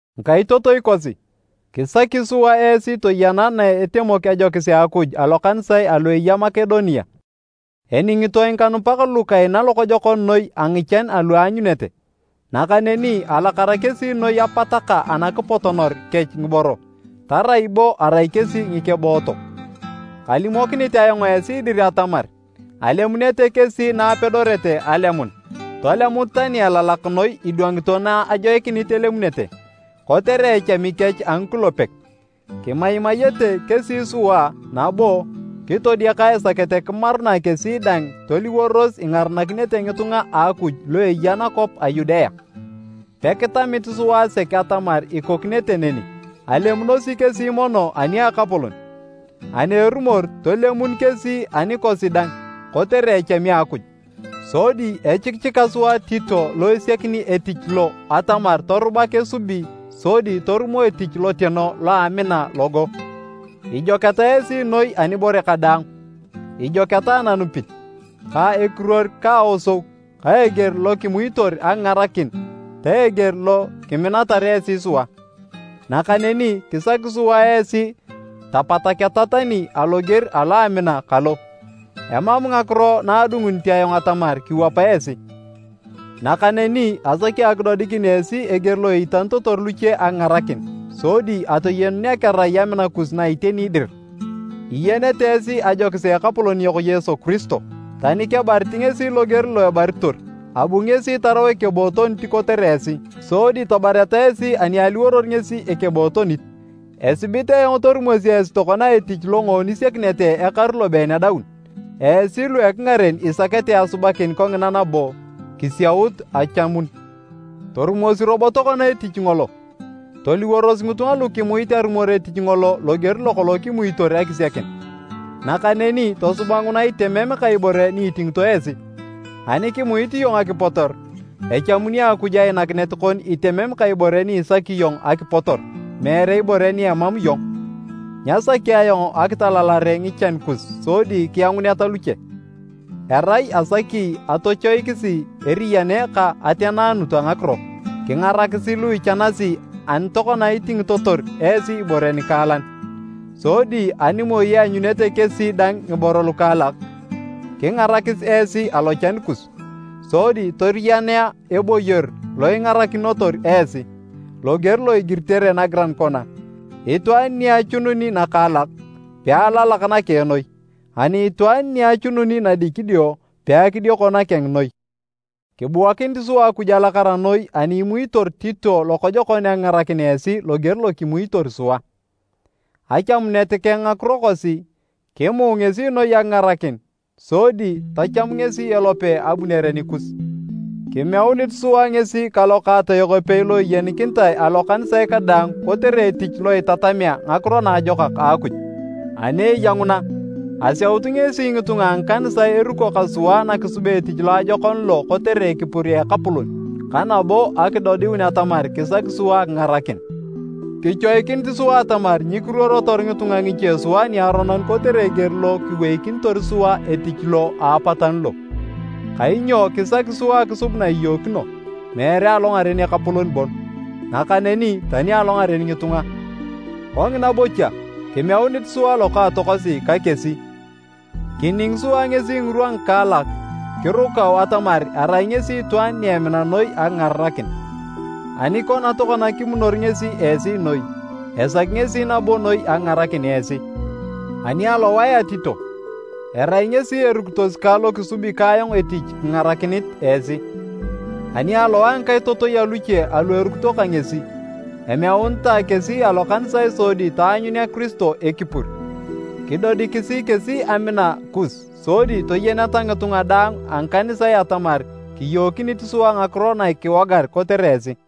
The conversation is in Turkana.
Ngikaitotoi kosi, kisaki sua esi toyena na etemok ajokis a Akuj alokanisae alu eya Makedonia. Eningitoe ngikanupak lu kaina lokojokon noi a ngichan alu aanyunete, nakaneni alakara kesi noi apataka anakipotonor kech ngiboro, tarai bo arai kesi ngikebootok. Kalimokinit ayong esi dir atamar alemunete kesi na apedorete alemun, tolemut tani elalak noi idwangito na ajoikinit elemunete. Kotere echami kech a ngikulepek, kimaimayete kesi sua nabo kitodiaka esakete kimarunae kesi dang toliworos ingaranakinete ngitunga a Akuj lu eya nakwap a Yudea. Pekitamit sua sek atamar ikokinete neni! Alemunosi kesi mono ani a Ekapolon, ani erumor, tolemun kesi anikosi dang kotere echami a Akuj. Sodi echikichika sua Tito lo esiakini etich lo atamar torubak esubi sodi torumo etich loteno lo a amina logo. Ijoketa esi noi anibore kadaang, ijoketa ananupit, ka ekiruor ka aosou ka eger lo kimuitor akingarakin ta eger lo kiminatar esi sua. Nakaneni kisaki sua esi tapataketa tani aloger alo amina kalo. Emam ngakiro na adungunit ayong atamar kiwapa esi. Nakaneni asaki akidodikin esi eger lo iitanitotor luche akingarakin sodi atoyenunea kerai amina kus na iteni dir. Iyenete esi ajokis a Ekapolon yok Yesu Kiristo. Tani kebarit ngesi loger lo ebaritor, abu ngesi tarau ekebootonit kotere esi, sodi tabareta esi ani aliworor ngesi ekebootonit. Esibit ayong torumosi esi tokona etich longoon isiakinete ekaru lobeen adaun. Esi lu ekingaren isakete asubakin kongina nabo kisiaut achamun. Torumosi robo tokona etich ngolo! Toliworos ngitunga lu kimuit arumor etich ngolo loger lokolong kimuitor akisiakin, nakaneni tosuba nguna itemem ka ibore ni itingito esi. Ani kimuit iyong akipotor, echamuni Akuj ainakinet kon itemen ka ibore ni isaki iyong akipotor, meere ibore ni emam iyong. Nyasaki ayong akitalalare ngichan kus sodi kianguneta luche. Erai asaki atochoikisi eriyane ka ateneanut a ngakiro. Kingarakisi lu ichanasi ani tokona itingitotor esi ibore nikaalan. Sodi ani moi eanyunete kesi dang ngiboro lukaalak, kingarakis esi alochan kus. Sodi toriyanea eboyor lo ingarakinotor esi. Loger lo igiritere nagiran kona, “Itwaan ni achununi nakaalak, pealalak nakeng noi. Ani itwaan ni achununi nadikidio, peakidioko nakeng noi.” Kibuakinit sua Akuj alakara noi ani imuitor Tito lokojokon akingarakin esi loger lo kimuitor sua! Achamunet keng ngakiro kosi, kimuu ngesi noi akingarakin sodi tacham ngesi elope abunere nikus. Kimeunit sua ngesi ka lokaatoyok epei lo eyenikinitae alokanisae kadaang kotere etich lo itatamea ngakiro naajokak a Akuj. Ani eya nguna, aseut ngesi ngitunga a ngikanisae eruko ka sua na kisubea etich loajokon lo kotere ekipur a Ekapolon ka nabo akidodiun atamar kisaki sua akingarakin. Kichoikinit sua atamar nyikiruorotor ngitunga ngiche sua niaronon kotere eger lo kiweikinitor sua etich lo a apatanu lo. Kainyo kisaki sua akisub na iyookino, meere alongaren Ekapolon bon, nakaneni tani alongaren ngitunga. Kongina bocha, kimeunit sua lokaatokosi ka kesi. Kining sua ngesi ngirwa ngikaalak kirukau atamar erai ngesi itwaan ni emina noi akingarakin. Ani kona tokona kimunor ngesi esi noi, esaki ngesi nabo noi akingarakin esi. Ani alowae a Tito, erai ngesi erukitos kang lo kisubi ka ayong etich kingarakinit esi. Ani alowae a ngikaitotoi aluche alu erukito ka ngesi, emeunitae kesi alokanisae sodi taanyunea Kiristo ekipur. Kidodikisi kesi amina kus sodi toyeneta ngitunga daang a ngikanisae atamar kiyookinit sua ngakiro na kiwogar kotere esi.